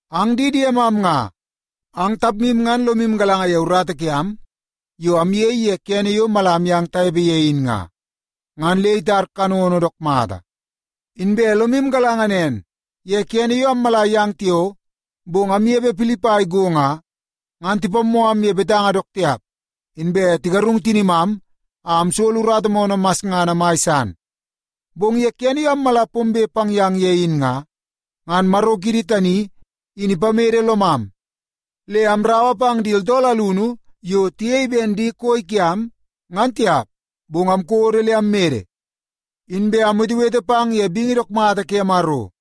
Ang di diemam nga, ang tapmu ngan lomu galanga ye urata kiam yo amyei ye kene yo mala amyang tanepe ye in nga, ngan le itar kanono dook mata. Inbe lomu galanga nen, ye kene yo ammala yang tiao, bong amnepe Pilipai go nga, ngan tipammoo am ye betanga dook tiap, inbe tigarung tinimam a amsolo urata moonoo masngana mai san. Bong ye kene yo ammala pombe pang yang ye in nga, ngan Maro kiidi tani in ipamede lomam le amraua pang di tooltool alunu yo tiyei ben di koi kiam, ngan tiap. Bong amkodo le ammede, inbe amwetewete pang ye bingi dook mata ke Maro.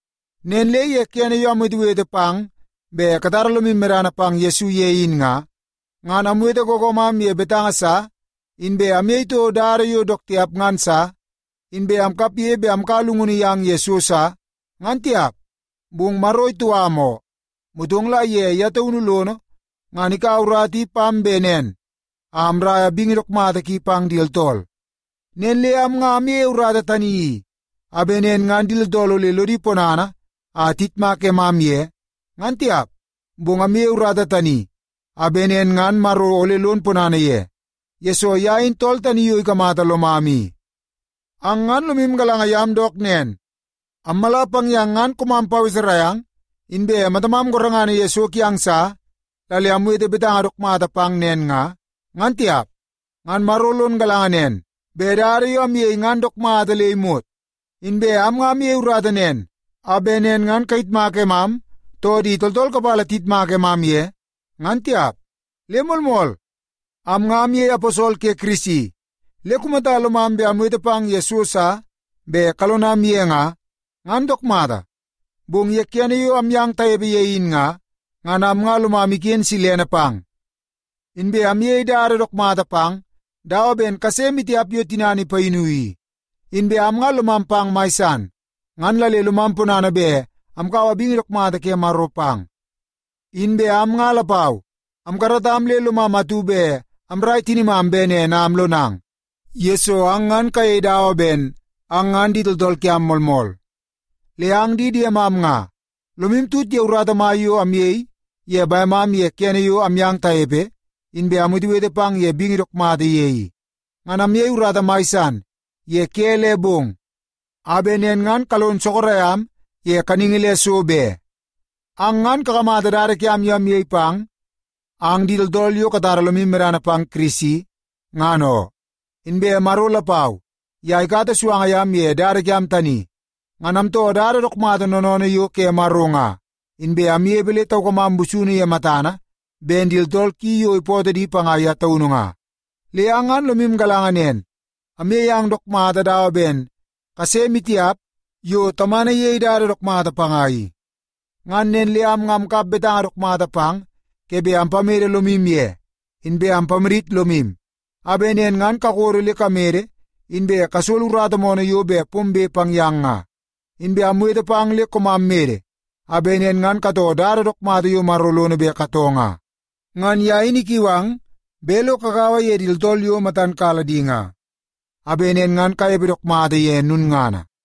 Nen le ye kene yo amwetewete pang bet katara lomu medana pang Yesu ye in nga, ngan amwete googoomam ye betanga sa, inbe amyei toko dada yo dook tiap ngan sa, inbe amkapge bet amkaua llungunu yang ye so sa, ngan tiap. Bong Maro itou am oo, motong la ye ye taunu lono ngan ikaua urata i pam bet nen a amraia bingi dook mata ki pang di tooltool. Nen le am nga amyeie urata tani i, a bet nen ngan di tooltool ole lodi ponana a tiyitmak emam ye, ngan tiap. Bong amyeie urata tani a bet nen ngan Maro ole lon ponana ye, yesoo ye in tool tani yo ikamata lomam i. Ang ngan lomu galanga yam dook nen, ammala pang yang ngan koomam paweserai ang, inbe matamam gorengana ye so kiang sa la le amwete betanga dook mata pang nen nga, ngan tiap. Ngan Maro lon galanga nen bet dada yo amyei ngan dook mata le imot. Inbe am nga amyei urata nen a bet nen ngan kayitmak emam, too di tooltool kapala tiyitmak emam ye, ngan tiap. Le moolmool, am nga amyei aposol ke Kirisi, le kumata lomam bet amwete pang ye so sa bet kalonam ye nga, ngan dook mata. Bong ye kene yo amyang tanepe ye in nga, ngan am nga lomam iken silene pang, inbe amyei dada dook mata pang dawa ben kase maitiap yo tinana ipayinu i. Inbe am nga lomam pang mai san, ngan la le lomam ponana bet amkaua bingi dook mata ke Maro pang. Inbe am nga lapau amkaratam le lomam atu bet amrai tinimam bet nen a amlonang, yesoo ang ngan kayei dawa ben ang ngan di tooltool kiam moolmool. Le ang di diemam nga, lomu tut ye urata mai yo amyei ye bemam ye kene yo amyang tanepe, inbe amwetewete pang ye bingi dook mata ye i. Ngan amyei urata mai san ye ke le bong a bet nen ngan kalon sorok am ye kaningi le so be. Ang ngan kakamata dada kiam yo amyei pang ang di tooltool yo katara lomu medana pang Kirisi, ngan oo. Inbe Maro lapau, ye ikata suanga yam ye dada kiam tani. Ngan amtoo dada dook mata noonoonoo yo ke Maro nga, inbe amnepe le taukamam busunu ye matana ben di tooltool ki yo ipootoo di panga ye taunu nga. Le ang ngan lomu galanga nen, amyei ang dook mata dawa ben kase maitiap yo tamana iyei dada dook mata panga i. Ngan nen le am nga amkap betanga dook mata pang ke bet ampamede lomu ye, inbe ampamadit lomu a bet nen ngan kakodo le kamede inbe kasolo urata moonoo yo bet pombe pang yang nga. Inbe amwete pang le koomam mede, a bet nen ngan katoo dada dook mata yo Maro lono bet katoo nga. Ngan ye in ikiu ang bet lo kagaua ye di tooltool yo matan kala di nga, a bet nen ngan kanepe dook mata ye lulngana.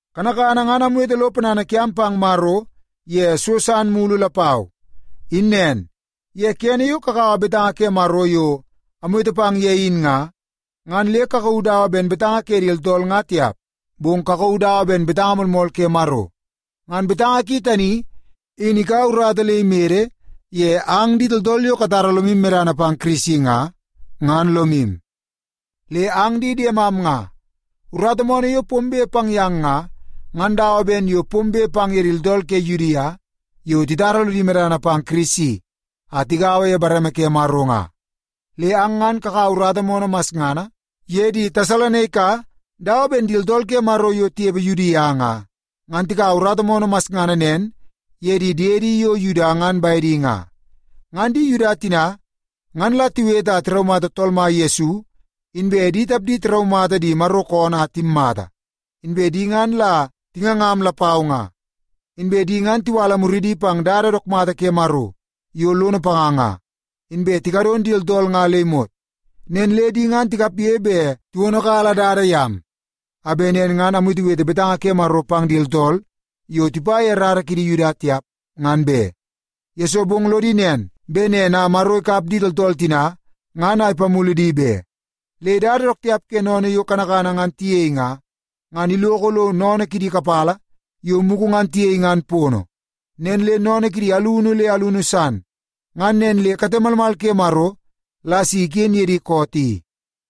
Kanakana ngan amwete lo ponana kiam pang Maro ye so san mulu lapau. In nen, ye kene yo kakaua betanga ke Maro yo amwete pang ye in nga, ngan le kakauu dawa ben betanga ke di tooltool nga tiap, bong kakauu dawa ben betanga moolmool ke Maro. Ngan betanga ki tani in ikaua urata le imede ye ang di tooltool yo katara lomu medana pang Kirisi nga, ngan lomu. Le ang di diemam nga, urata moonoo yo pombe pang yang nga, ngan dawa ben yo pombe pang ye di tooltool ke Yudia yo titara lodi medana pang Yesu Kirisi a tigaua ye bareme ke Maro nga. Le ang ngan kakaua urata moonoo masngana ye di Tesalonaika dawa ben di tooltool ke Maro yo tinepe Yudia nga, ngan tikaua urata moonoo masngana nen ye di diedi yo Yuda ngan bedi nga. Ngan di Yuda tina, ngan la tiwete a tiraumata Tool Mai Yesu, inbe di tapdi tiraumata di Maro koonoo a timmata, inbe di ngan la tingangam lapau nga. Inbe di ngan tiwala muridi pang dada dook mata ke Maro yo lono panga nga, inbe tikadon di tooltool nga le imot. Nen le di ngan tikapge bet tiwonokala dada yam, a bet nen ngan amwetewete betanga ke Maro pang di tooltool yo tipa ye rara kidi Yuda tiap, ngan be. Yesoo bong lodi nen, bet nen a Maro ikap di tooltool tina ngan a ipamulu di be. Le dada dook tiap ke sennene yo kanakana ngan tiyei nga, ngan iloko lo sennene kidi kapala yo mugu ngan tiyei ngan pono, nen le sennene kidi alunu le alunu san. Ngan nen le kate malmal ke Maro la si iken ye di koot i.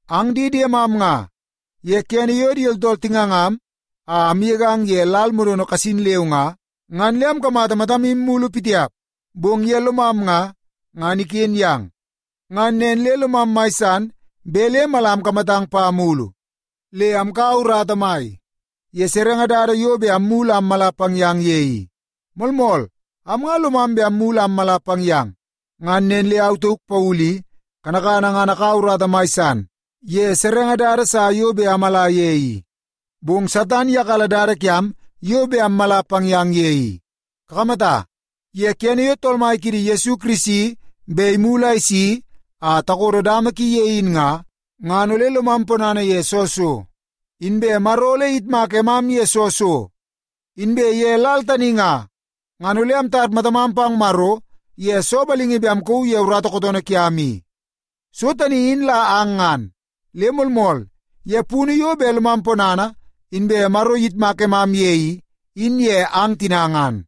Ang di diemam nga, ye kene yo di tooltool tingangam a amgegang ye lal modono kasin leu nga, ngan le amkamata matamu mulu pitiap, bong ye lomam nga, ngan iken yang. Ngan nen le lomam mai san bet le mala amkamatang pa mulu. Le amkaua urata mai ye serenge dada yo bet ammulu a ammala pang yang ye i. Moolmool, am nga lomam bet ammulu a ammala pang yang, ngan nen le au tauk Paulu i, kanakana ngan akaua urata mai san ye serenge dada sa yo bet amala ye i, bong Satan iyakala dada kiam yo bet ammala pang yang ye i. Kakamata, ye kene yo Tool Mai kiidi Yesu Kirisi bet imulu a isi a takodo dama ki ye in nga, ngan ole lomam ponana ye soo so? Inbe Maro ole iyitmak emam ye soo so? Inbe ye lal tani nga, ngan ole amtar matamam pang Maro ye soo balingi bet amkauu ye urata kootoonoo kiam i? So tani in la ang ngan. Le moolmool, ye punu yo bet lomam ponana inbe Maro iyitmak emam ye i, in ye ang tina ngan.